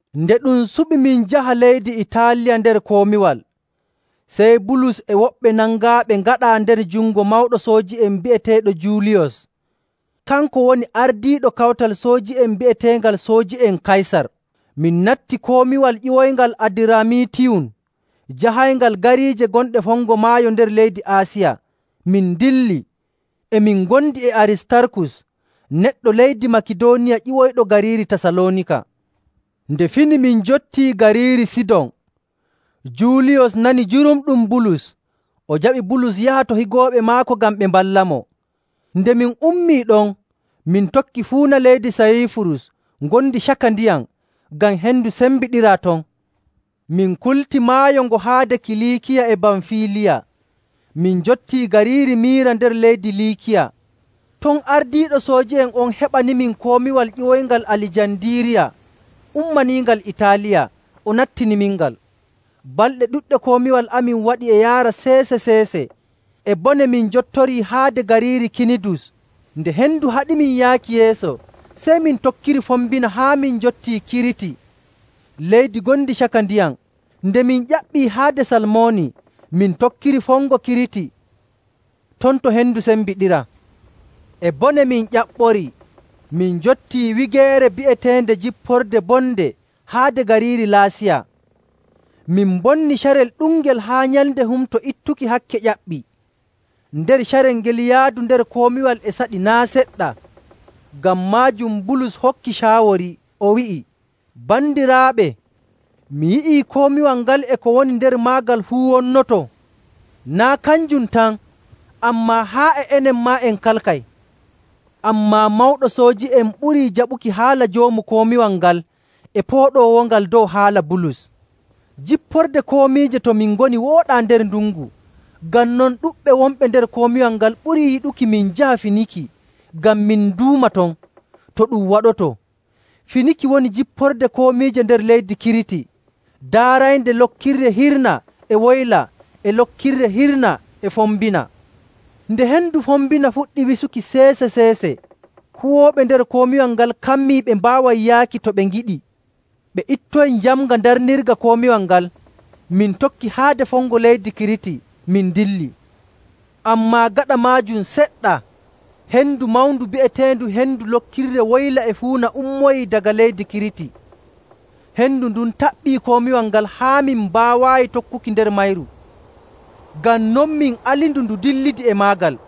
Nde ɗum suɓi min njaha leydi Itaaliya nder komiwal, sey Bulus e woɓɓe nangaaɓe ngaɗaa nder jungo mawɗo sooji'en bi'eteeɗo Juuliyos. Kanko woni ardiiɗo kawtal sooji'en bi'eteengal Sooji'en Kaysar. Min natti komiwal ƴiwoyngal Adiramitiiyum jahayngal gariije gonɗe fongo maayo nder leydi Aasiya; min ndilli. E min ngondi e Aristarkus, neɗɗo leydi Makidooniya ƴiwoyɗo gariiri Tasaloonika. Nde fini min njottii gariiri Sidon. Juuliyos nani jurumɗum Bulus; o jaɓi Bulus yaha to higooɓe maako ngam ɓe mballamo. Nde min ummii ɗon, min tokki fuuna leydi Sayiifurus ngondi caka ndiyam, ngam hendu sembiɗiraa ton. Min kulti maayo ngo haade Kiliikiya e Bamfiiliya, min njottii gariiri Mira nder leydi Liikiya. Ton ardiiɗo sooji'en on heɓanimin komiwal ƴiwoyngal Alijandiiriya ummaniingal Itaaliya, o nattinimingal. Balɗe ɗuɗɗe komiwal amin waɗi e yaara seese‑seese. E bone min njottorii haade gariiri Kinidus. Nde hendu haɗimin yaaki yeeso, sey min tokkiri fombina haa min njotti Kiriti, leydi ngondi caka ndiyam. Nde min ƴaɓɓii haade Salmoni min tokkiri fongo Kiriti ton to hendu sembiɗiraa. E bone min ƴaɓɓorii, min njottii wigeere bi'eteende Jipporde Bonde haade gariiri Laasiya. Min mbonni carel ɗungel haa nyalnde Humto Ittuki Hakke ƴaɓɓii. Nder carel ngel yaadu nder komiwal e saɗi naa' seɗɗa. Ngam maajum Bulus hokki caawori, o wi'i, “Bandiraaɓe, mi yi'ii komiwal ngal e ko woni nder maagal fuu wonnoto. Naa' kanjum tan, ammaa haa e enen maa en kalkay.” Ammaa mawɗo sooji'en ɓurii jaɓuki haala joomu komiwal ngal e pooɗoowo ngal dow haala Bulus. Jipporde komiije to min ngoni wooɗaa nder ndungu. Ngam non ɗuɗɓe wonɓe nder komiwal ngal ɓurii yiɗuki min njaha Finiki ngam min nduuma ton, to ɗum waɗoto. Finiki woni jipporde komiije nder leydi Kiriti, daaraynde lokirre hirnaa e woyla e lokirre: Waato sogonde. hirnaa e fombina. Nde hendu fombina fuɗɗi wisuki seese‑seese, huwooɓe nder komiwal ngal kammii ɓe mbaaway yaaki to ɓe ngiɗi. Ɓe ittoyi njamnga darnirga komiwal ngal, min tokki haade fongo leydi Kiriti, min ndilli. Ammaa gaɗa maajum seɗɗa, hendu mawndu bi'eteendu hendu lokirre woyla e fuuna ummoyii daga leydi Kiriti. Hendu ndun taɓɓii komiwal ngal haa min mbaawaayi tokkuki nder mayru. Ngam non, min alindu ndu dillidi e maagal.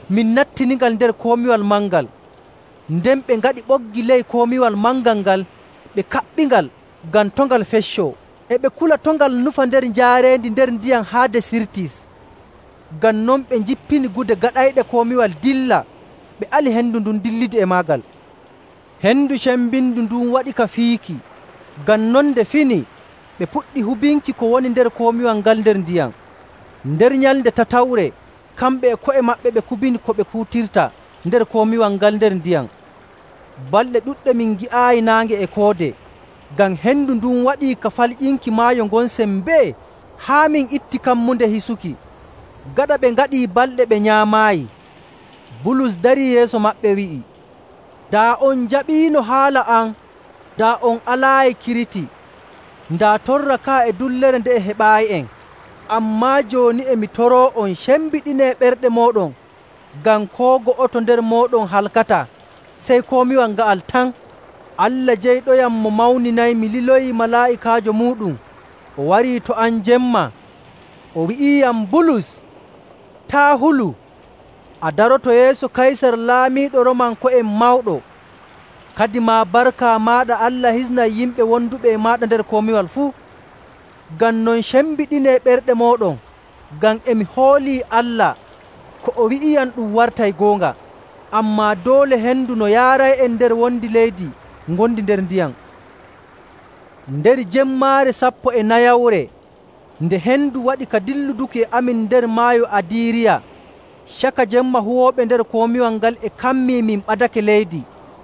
min nattiningal nder komiwal mangal. Nden ɓe ngaɗi ɓoggi ley komiwal mangal ngal, ɓe kaɓɓingal, ngam to' ngal feccoo. E ɓe kula to' ngal nufa nder njaareendi nder ndiyam haade Sirtis. Ngam non ɓe njippini gude gaɗayɗe komiwal dilla, ɓe ali hendu dillidi e maagal. Hendu cembindu ndun waɗi ka fiiki. Ngam non nde fini ɓe puɗɗi hubinki ko woni nder komiwal ngal nder ndiyam. Nder nyalnde tatawre, kamɓe e ko'e maɓɓe ɓe kubini ko ɓe kuutirta nder komiwal ngal nder ndiyam. Balɗe ɗuɗɗe min ngi'aayi naange e koode, ngam hendu ndun waɗii ka falƴinki maayo ngon sembee haa min itti kammunde hisuki. Gaɗa ɓe ngaɗii balɗe ɓe nyaamaayi, Bulus darii yeeso maɓɓe, wi'i, “Daa on njaɓiino haala am, daa on alaayi Kiriti, daa torra ka'a e dullere nde'e heɓaayi'en. Ammaa jooni e mi toroo'on, cembiɗinee ɓerɗe mooɗon, ngam koo go'oto nder mooɗon halkataa, sey komiwal nga'al tan. Allah jeyɗoyam mo mawninaymi liloyii malaa'ikaajo muuɗum, o warii to am jemma. O wi'iyam, ‘Bulus, taa' hulu, a daroto yeeso Kaysar laamiiɗo Roomanko'en mawɗo. Kadimaa, barka maaɗa Allah hisnay yimɓe wonduɓe e maaɗa nder komiwal fuu.’ Ngam non, cembiɗinee ɓerɗe mooɗon, ngam e mi hoolii Allah, ko o wi'iyam ɗum wartay goonga. Ammaa doole hendu no yaaray'en nder wondi leydi ngondi nder ndiyam.” Nder jemmaare sappo e nayawre, nde hendu waɗi ka dilluduki e amin nder Maayo Adiiriya, caka jemma huwooɓe nder komiwal ngal e kammii min ɓadake leydi,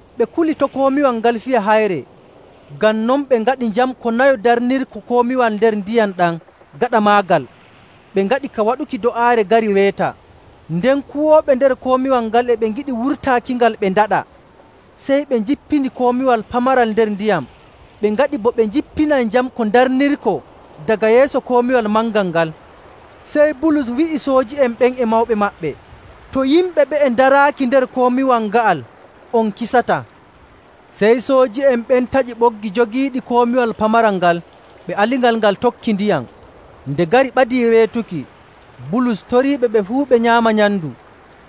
Ɓe kuli to komiwal ngal fiya hayre, ngam non ɓe ngaɗi njamko nayo ndarnirko komiwal nder ndiyam ɗam gaɗa maagal, ɓe ngaɗi ka waɗuki do'aare gari weeta. Nden kuwooɓe nder komiwal ngal e ɓe ngiɗi wurtaakingal ɓe ndaɗa, sey ɓe njippini komiwal pamaral nder ndiyam, ɓe ngaɗi bo ɓe njippinay njamko ndarnirko daga yeeso komiwal mangal ngal. Sey Bulus wi'i sooji'en ɓen e mawɗo maɓɓe, “To yimɓe ɓe'e ndaraaki nder komiwal nga'al on kisataa.” Sey sooji'en ɓen taƴi ɓoggi jogiiɗi komiwal pamaral ngal, ɓe alingal ngal tokki ndiyam. Nde gari ɓadii weetuki, Bulus toriiɓe ɓe fuu ɓe nyaama nyamndu.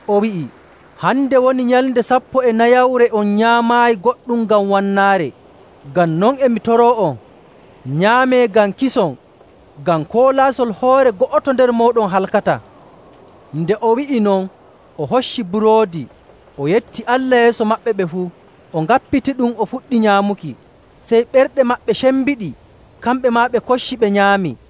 O wi'i, “Hande woni nyalnde sappo e nayawre on nyaamaayi goɗɗum ngam wannaare. Ngam non e mi toroo'on, nyaamee ngam kison, ngam koo laasol hoore go'oto nder mooɗon halkataa.” Nde o wi'i non, o hocci buroodi, o yetti Allah yeeso maɓɓe ɓe fuu, o ŋappitiɗum o fuɗɗi nyaamuki. Sey ɓerɗe maɓɓe cembiɗi, kamɓe maa ɓe kocci ɓe nyaami.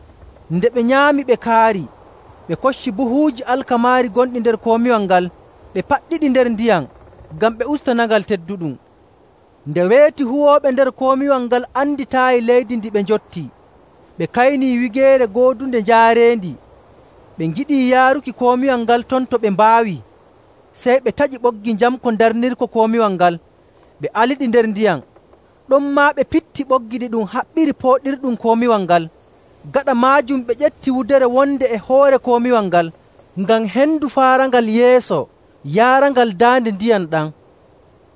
Nde ɓe nyaami ɓe kaari, ɓe kocci buhuuji alkamaari gonɗi nder komiwal ngal, ɓe paɗɗiɗi nder ndiyam ngam ɓe ustanangal tedduɗum. Nde weeti huwooɓe nder komiwal ngal anditaayi leydi ndi ɓe njotti. Ɓe kaynii wigeere goodunde njaareendi. Ɓe ngiɗii yaaruki komiwal ngal ton to ɓe mbaawii. Sey ɓe taƴi ɓoggi njamko ndarnirko komiwal ngal, ɓe aliɗi nder ndiyam. Ɗonmaa ɓe pitti ɓoggi ɗiɗum haɓɓiri pooɗirɗum komiwal ngal. Gaɗa maajum, ɓe ƴefti wudere wonde e hoore komiwal ngal, ngam hendu faarangal yeeso, yaarangal daande ndiyam ɗam.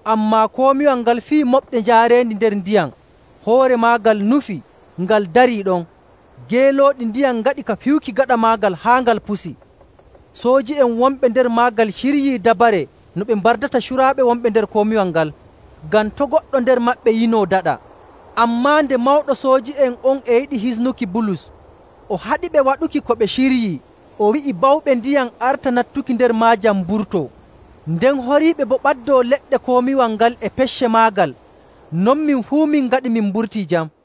Ammaa komiwal ngal fiyi moɓde njaareendi nder ndiyam, hoore maagal nufi, ngal darii ɗon. Geelooɗi ndiyam ngaɗi ka piyuki gaɗa maagal haa ngal pusi. Sooji'en wonɓe nder maagal ciryii dabare no ɓe mbardata curaaɓe wonɓe nder komiwal ngal, ngam to' goɗɗo nder maɓɓe yinoo daɗa. Ammaa nde mawɗo sooji'en on e yiɗi hisnuki Bulus, o haɗiɓe waɗuki ko ɓe ciryii, o wi'i bawɓe ndiyam arta nattuki nder maajam, mburtoo. Nden horiiɓe boo mbaɗɗoo leɗɗe komiwal ngal e pecce maagal. Non min fuu min ngaɗi min mburtii jam.